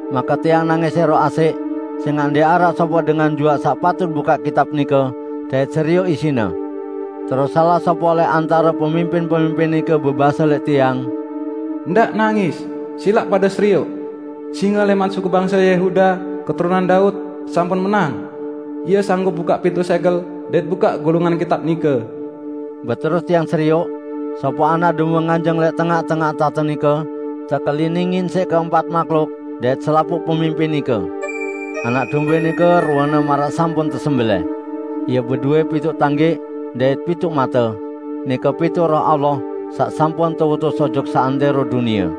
Make tiang nangis ẽroq asẽq sẽngaq ndẽq araq sopoq dengan juaq saq patut bukaq kitab nike, dait serioq isine. Terus salaq sopoq lẽq antare pemimpin-pemimpin nike bebase lẽq tiang, "Ndaq nangis! Silaq pade serioq! Singe lẽman suku bangse Yehuda, keturunan Daud, sampun menang. Ie sanggup bukaq pituq sẽgel dait bukaq gulungan kitab nike." Beterus tiang serioq, sopoq Anak Dombe nganjeng lẽq tengaq-tengaq tahte nike, tekeliningin siq keempat mahluk dait selapuq pemimpin nike. Anak Dombe nike ruene maraq sampun tesembelẽh. Ie bedowẽ pituq tanggẽq dait pituq mate: Nike pituq Roh Allah saq sampun teutus ojok seantẽro dunie.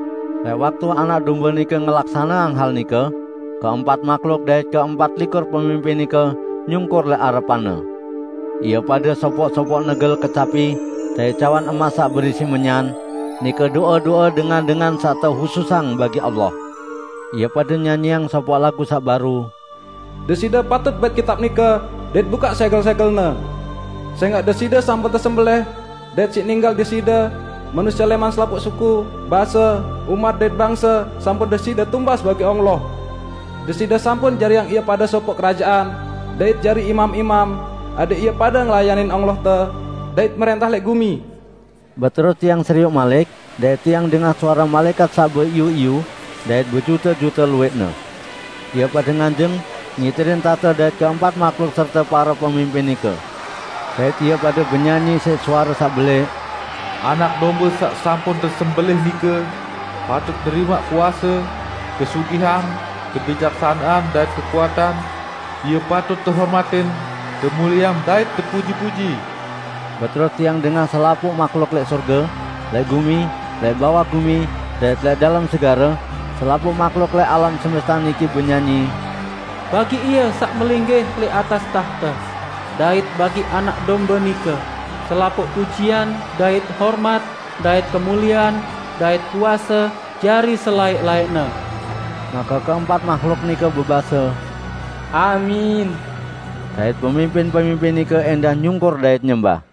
Lẽq waktu Anak Dombe nike ngelaksaneang hal nike, keempat mahluk dait keempat likur pemimpin nike nyungkur lẽq arepan-Ne. Ie pade sopoq-sopoq negel kecapi dait cawan emas saq berisi menyan, nike do'e-do'e dengan-dengan saq tehususang bagi Allah. Ie pade nyanyiang sopoq lagu saq baru: "Deside patut bait kitab nike, dait bukaq sẽgel-sẽgelne. Sẽngaq Deside sampun tesembelẽh, dait siq ninggal Deside, manusie lẽman selapuq suku, base, umat dait bangse sampun Deside tumbas bagi Allah. Deside sampun jariang ie pade sopoq kerajaan, dait jari imam-imam, adẽq ie pade ngelayanin Allahte, dait mrẽntah lẽq gumi." Beterus tiang serioq malik dait Tiang dengah suare malaẽkat saq beiyu-iyu dait bejute-jute luwẽqne. Ie pade nganjeng ngiterin tahte dait keempat mahluk serte pare pemimpin nike. Dait ie pade benyanyi siq suare saq belẽq, "Anak Dombe saq sampun tesembelẽh nike, patut nerimaq kuase, kesugihan, kebijaksanean dait kekuatan; Ie patut tehormatin, temulieang dait tepuji-puji!" Beterus tiang dengah selapuq mahluk lẽq sorge, lẽq gumi, lẽq bawaq gumi dait lẽq dalem segare -- selapuq mahluk lẽq alam semeste niki -- benyanyi, "Bagi Ie saq melinggih lẽq atas tahte, dait bagi Anak Dombe nike, selapuq pujian dait hormat dait kemuliean dait kuase jari selaẽq-laẽqne!" Make keempat mahluk nike bebase, "Amin!" Dait pemimpin-pemimpin nike ẽndah nyungkur dait nyembah.